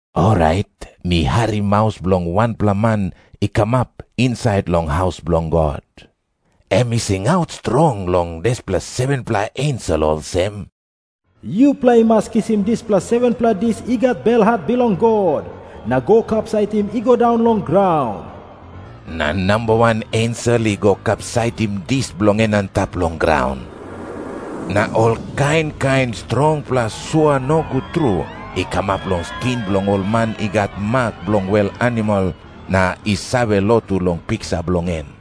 Orait mi harim maus bilong wanpela man i kamap insait long haus bilong God. Em i singaut strong long dispela 7-pela ensel olsem, “Yupela i mas kisim dispela 7-pela dis i gat belhat bilong God, na go kapsaitim i go daun long graun.” Na namba wan ensel i go kapsaitim dis bilong en antap long graun. Na ol kain kain strongpela sua nogut tru i kamap long skin bilong ol man i gat mak bilong wel animal na i save lotu long piksa bilong en.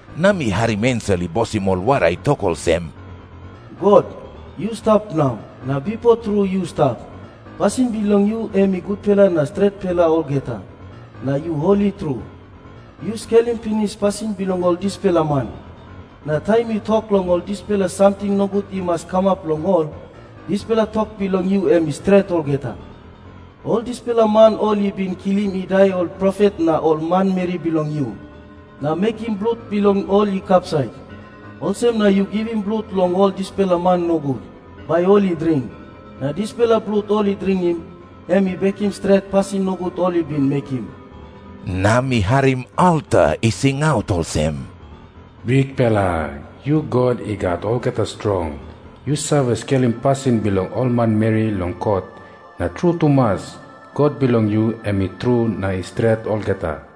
Na mi harim ensel i bosim ol wara i tok olsem, “God, yu stap nau, na bipo tru yu stap. Pasin bilong yu em i gutpela na stretpela olgeta, na yu holi tru. Yu skelim pinis pasin bilong ol dispela man, na taim yu tok long ol dispela samting nogut i mas kamap long ol, dispela tok bilong yu em i stret olgeta. Ol dispela man ol i bin kilim i dai ol profet na ol manmeri bilong yu, na mekim blut bilong ol i kapsait. Olsem na yu givim blut long ol dispela man nogut, bai ol i dring. Na dispela blut ol i dringim, em i bekim stret pasin nogut ol i bin mekim.” Na mi harim alta i singaut olsem, “Bikpela, yu God I Gat Olgeta Strong. Yu save skelim pasin bilong ol manmeri long kot, na tru tumas, kot bilong yu em i tru na i stret olgeta.”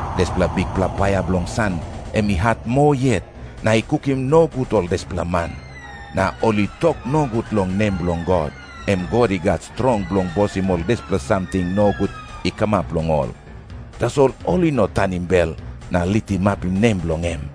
Dispela bikpela paia bilong san em i hat moa yet, na i kukim nogut ol dispela man. Na ol i tok nogut long nem bilong God, em God i gat strong bilong bosim ol dispela samting nogut i kamap long ol. Tasol ol i no tanim bel na litimapim nem bilong em.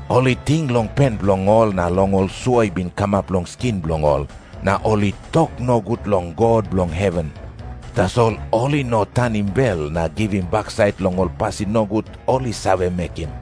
Ol i ting long pen bilong ol na long ol sua i bin kamap long skin bilong ol, na ol i tok nogut long God bilong heven. Tasol ol i no tanim bel na givim baksait long ol pasin nogut ol i save mekim.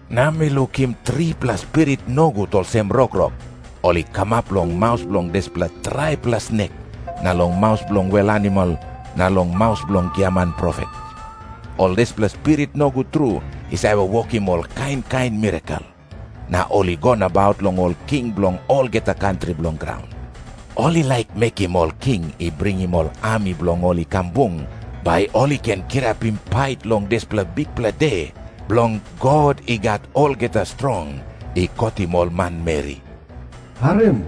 Na mi lukim tripela spirit nogut olsem rokrok, ol i kamap long maus bilong dispela traipela snek na long maus bilong wel animal na long maus bilong giaman profet. Ol dispela spirit nogut tru i save wokim ol kain kain mirakel, na ol i go nabaut long ol king bilong olgeta kantri bilong graun. Ol i laik mekim ol king i bringim ol ami bilong ol i kam bung, bai ol i ken kirapim pait long dispela bikpela de bilong God I Gat Olgeta Strong i kotim ol manmeri. “Harim.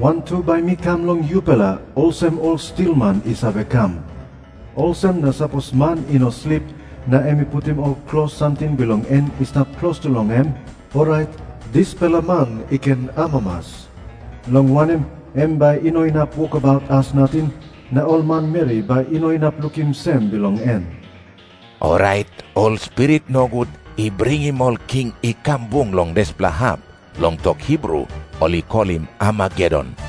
Wantu bai mi kam long yupela olsem ol stilman i save kam. Olsem na sapos man i no slip, na em i putim ol klos samting bilong en i stap klostu long em, orait dispela man i ken amamas, long wanem, em bai i no inap wokabaut as nating na ol manmeri bai i no inap lukim sem bilong en.” Orait ol spirit nogut i bringim ol king i kam bung long dispela hap, long tok Hibru ol i kolim Armagedon.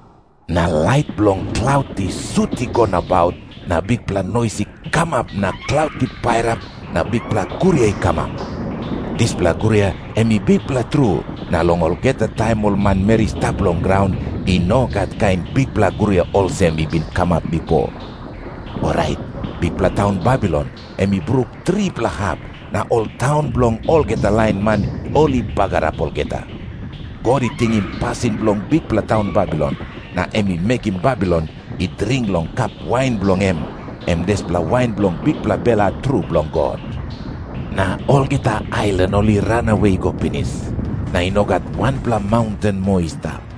Na lait bilong klaut i sut i go nabaut na bikpela nois i kamap na klaut i pairap na bikpela guria i kamap. Dispela guria em i bikpela tru, na long olgeta taim ol manmeri i stap long graun, i no gat kain bikpela guria olsem i bin kamap bipo. Orait bikpela taun Babilon em i bruk tripela hap, na ol taun bilong olgeta lain man ol i bagarap olgeta. God i tingim pasin bilong bikpela taun Babilon, na em i mekim Babilon i dring long kap wain bilong em, em dispela wain bilong bikpela belhat tru bilong God. Na olgeta ailan ol i ranawe i go pinis, na i no gat wanpela maunten moa i stap.